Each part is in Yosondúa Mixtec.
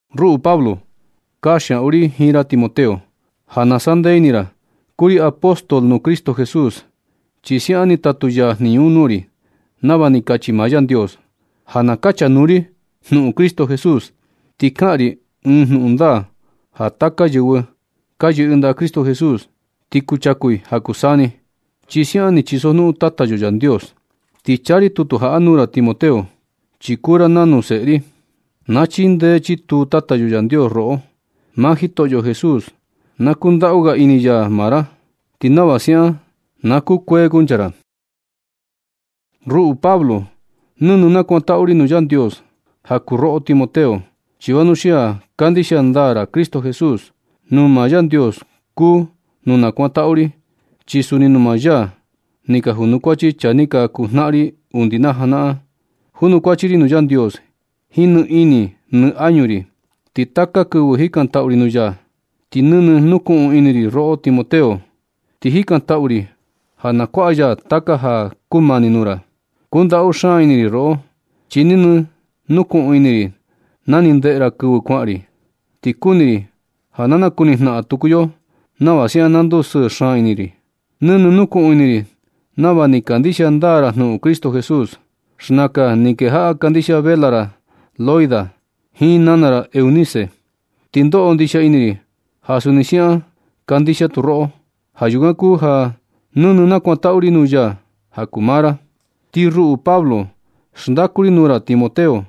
Ruꞌu Pablo, kanxiaꞌu ri jiin ra Timoteo, ja na sandee ini ra. Kuu ri apóstol nuu Cristo Jesús, chi siaꞌan ni tatu ya jniñu un nuu ri, nava ni kachi maa Yandios ja na kachanuu ri jnuꞌun Cristo Jesús. Ti kaꞌan ri ɨɨn jnuꞌun ndaa ja taka yɨvɨ ka yɨꞌɨ ndaꞌa Cristo Jesús, ti kuchaku i ja kuu saa ni, chi siaꞌan ni chisojnuꞌun Tata yo Yandios. Ti chaa ri tutu jaꞌa nuu ra Timoteo, chi kuu ra nanu ɨɨn seꞌe ri. Na chindee chituu Tata yo Yandios roꞌo. Maa Jitoꞌo Jesús na kundaꞌu ga ini ya maa ra, ti nava siaꞌan na kukuee kuncha ra. Ruꞌu Pablo, nɨnɨ nakuantaꞌu ri nuu Yandios ja kuu roꞌo Timoteo, chi vanuxia kandixia ndaa ra Cristo Jesús. Nuu maa Yandios kuu nu nakuantaꞌu ri, chi suni nuu maa ya ni ka junkuachi chaa ni ka kuu jnaꞌan ri undi na janaꞌan. Junukuachi ri nuu Yandios jiin nɨ ini nɨ añu ri. Ti taka kɨvɨ jikantaꞌu ri nuu ya, ti nɨnɨ nukuꞌun ini ri roꞌo Timoteo. Ti jikantaꞌu ri ja na kuaꞌa ya taka ja na kumani nuu ra. Kundaꞌu xaan ini ri roꞌo, chi nɨnɨ nukuꞌun ini ri na ni ndeꞌe ra kɨvɨ kuaꞌan ri. Ti kuni ri ja na nakuni jnaꞌan tuku yo nava siaꞌan na ndusɨɨ xaan ini ri. Nɨnɨ nukuꞌun ini ri nava ni kandixia ndaa ra jnuꞌun Cristo Jesús. Xnakan ni kejaꞌa kandixia vela ra Loida jiin nana ra Eunice, ti ndoꞌo ndixia ini ri ja suni siaꞌan kandixia tu roꞌo. Ja yukan kuu ja nɨnɨ nakuantaꞌu ri nuu ya ja kuu maa ra. Ti ruꞌu Pablo, xndaku ri nuu ra Timoteo,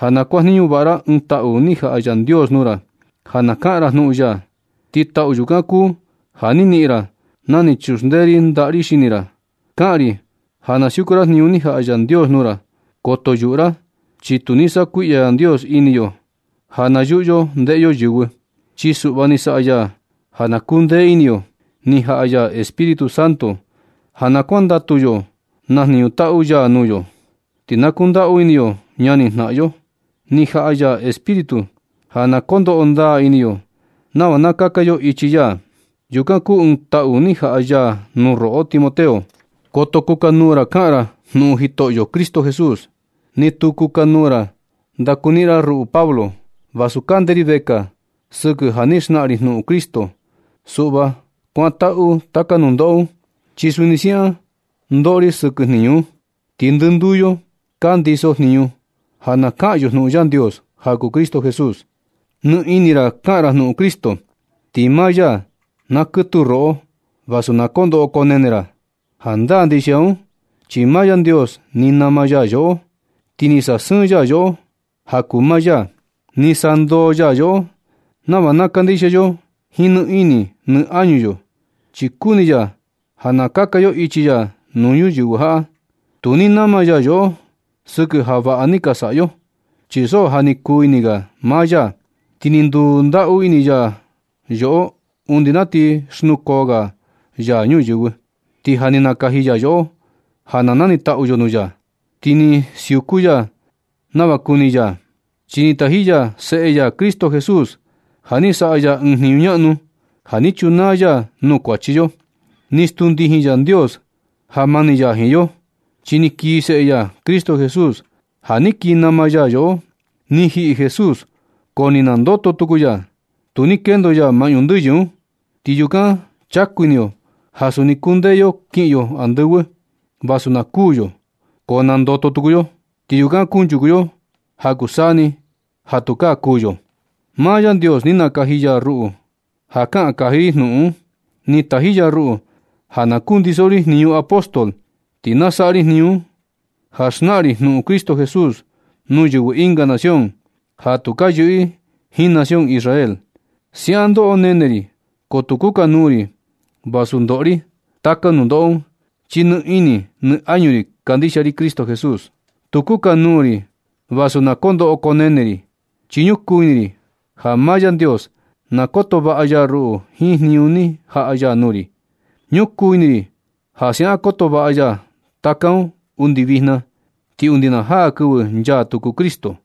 ja na kuajniñu vaꞌa ra ɨɨn taꞌu ni jaꞌa Yandios nuu ra, ja na kaꞌan ra jnuꞌun ya. Ti taꞌu yukan kuu ja ni niꞌin ra na ni chuxndee ri ndaꞌa ri xini ra. Kaꞌan ri ja na siuku ra jniñu ni jaꞌa Yandios nuu ra. Koto yuꞌu ra, chi tu ni saꞌa kuiꞌya Yandios ini yo ja na yuꞌu yo ndeꞌe yo yɨvɨ. Chi suꞌva ni saꞌa ya ja na kuu ndee ini yo. Ni jaꞌa ya Espíritu Santo ja na kuandatu yo na jniñu taꞌu ya nuu yo, ti na kundaꞌu ini yo ñani jnaꞌan yo. Ni jaꞌa ya Espíritu ja na kondoꞌo ndaa ini yo nava na kaka yo ichi ya. Yukan kuu ɨɨn taꞌu ni jaꞌa ya nuu roꞌo Timoteo. Koto kukanuu ra kaꞌan ra jnuꞌun Jitoꞌo Cristo Jesús. Ni tu kukanuu ra ndakuniꞌin ra ruꞌu Pablo, vasu kande ri vekaa sɨkɨ ja ni xnaꞌan ri jnuꞌun Cristo. Suꞌva kuantaꞌu taka nundoꞌo un, chi suni siaꞌan ndoꞌo ri ja sɨkɨ jniñu un, ti ndɨnduu yo ka ndiso jniñu ja na kaꞌan yo jnuꞌun Yandios ja kuu Cristo Jesús. Nɨ ini ra kaꞌan ra jnuꞌun Cristo, ti maa ya na kɨtuu roꞌo vasu na koo ndoꞌo koo nene ra. Jandaa ndixia un chi maa Yandios ni nama ya yoꞌo, ti ni sasɨɨn ya yoꞌo ja kuu maa ya. Ni sandoo ya yoꞌo nava na kandixia yo jiin nɨ ini nɨ añu yo. Chi kuni ya ja na kaka yo ichi ya nuu ñuyɨvɨ jaꞌa. Tu ni nama ya yoꞌo sɨkɨ ja vaꞌa ni ka saꞌa yo, chi so ja ni kuu ini ga maa ya, ti ni ndundaꞌu ini ya yoꞌo undi na ti xnukoo ga ya ñuyɨvɨ, ti ja ni nakaji ya yoꞌo ja na nanitaꞌu yo nuu ya. Ti ni suku ya nava kuni ya, chi ni taji ya Seꞌe ya Cristo Jesús ja ni saꞌa ya ɨɨn jniñu ñaꞌnu ja ni chunaa ya nuu kuachi yo. Ni stuu ndijin Yandios ja mani ya jiin yo, chi ni kii Seꞌe ya Cristo Jesús ja ni kii nama ya yoꞌo. Ni jiꞌi Jesús ko ni nandoto tuku ya. Tu ni kendo ya maꞌñu ndɨyɨ un. Ti yukan chaku ini yo ja suni kundee yo kiꞌin yo andɨvɨ. Vasu na kuū yo ko nandoto tuku yo. Ti yukan kunchuku yo ja kuu saa ni ja tukaa kuū yo. Maa Yandios ni nakaji ya ruꞌu ja kaꞌan kaji ri jnuꞌun un. Ni taji ya ruꞌu ja na kundiso ri jniñu apóstol, ti na saꞌa ri jniñu un, ja xnaꞌan ri jnuꞌun Cristo Jesús nuu yɨvɨ ɨnga nación ja tu ka yɨꞌɨ jiin nación Israel. Siaꞌan ndoꞌo nene ri. Ko tu kukanuu ri vasu kondoꞌo ri taka nundoꞌo un, chi nɨ ini nɨ añu ri kandixia ri Cristo Jesús. Tu kukanuu ri vasu na koo ndoꞌo koo nene ri, chi ñukuu ini ri ja maa Yandios na koto vaꞌa ya ruꞌu jiin jniñu ni jaꞌa ya nuu ri. Ñukuu ini ri ja siaꞌan koto vaꞌa ya taka un undi vijna ti undi na jaa kɨvɨ nchaa tuku Cristo.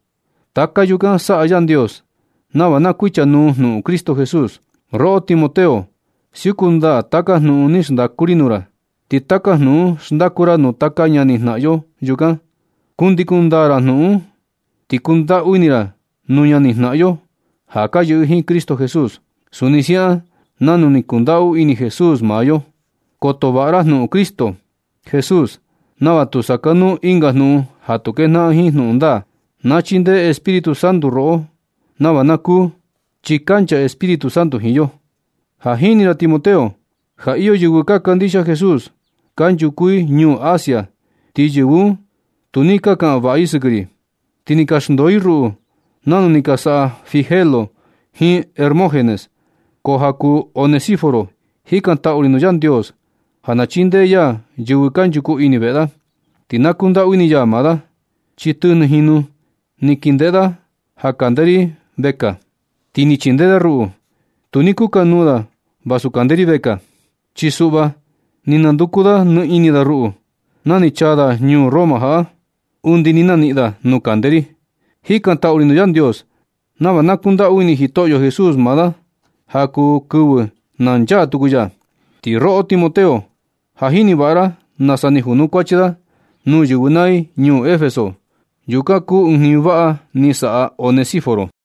Taka yukan saꞌa Yandios nava na kuichanuu jnuꞌun Cristo Jesús. Roꞌo Timoteo, siuku ndaa taka jnuꞌun ni xndaku ri nuu ra, ti taka jnuꞌun un xndaku ra nuu taka ñani jnaꞌan yo yukan. Kundikun ndaa ra jnuꞌun un, ti kundaꞌu ini ra nuu ñani jnaꞌan yo ja ka yɨꞌɨ jiin Cristo Jesús, suni siaꞌan nanu ni kundaꞌu ini Jesús maa yo. Koto vaꞌa ra jnuꞌun Cristo Jesús nava tu sakanuu ɨnga jnuꞌun ja tu kejnaꞌan jiin jnuꞌun ndaa. Na chindee Espíritu Santo roꞌo nava na kuu, chi kancha Espíritu Santo jiin yo. Ja jini ra Timoteo, ja iyo yɨvɨ ka kandixia Jesús kanchuku i ñuu Asia, ti yɨvɨ un tu ni ka kaꞌan vaꞌa i sɨkɨ ri. Ti ni ka xndoo i ruꞌu nanu ni ka saꞌa Figelo jiin Hermógenes. Ko ja kuu Onesíforo, jikantaꞌu ri nuu Yandios ja na chindee ya yɨvɨ kanchuku ini veꞌe da, ti na kundaꞌu ini ya maa da, chi tɨjnɨ jinu ni kindeꞌe da ja kande ri presu, ti ni chindee da ruꞌu. Tu ni kukanuu da vasu kande ri vekaa. Chi suꞌva ni nanduku nɨ ini da ruꞌu, na ni chaa da ñuu Roma jaꞌa, undi ni naniꞌin da nuu kande ri. Jikantaꞌu ri nuu Yandios nava na kundaꞌu ini Jitoꞌo Jesús maa da ja kuu kɨvɨ na nchaa tuku ya. Ti roꞌo Timoteo, ja jini vaꞌa ra nasa ni janukuachi da nuu yɨvɨ naa i ñuu Efeso. Yukan kuu ɨɨn jniñu vaꞌa ni saꞌa Onesíforo.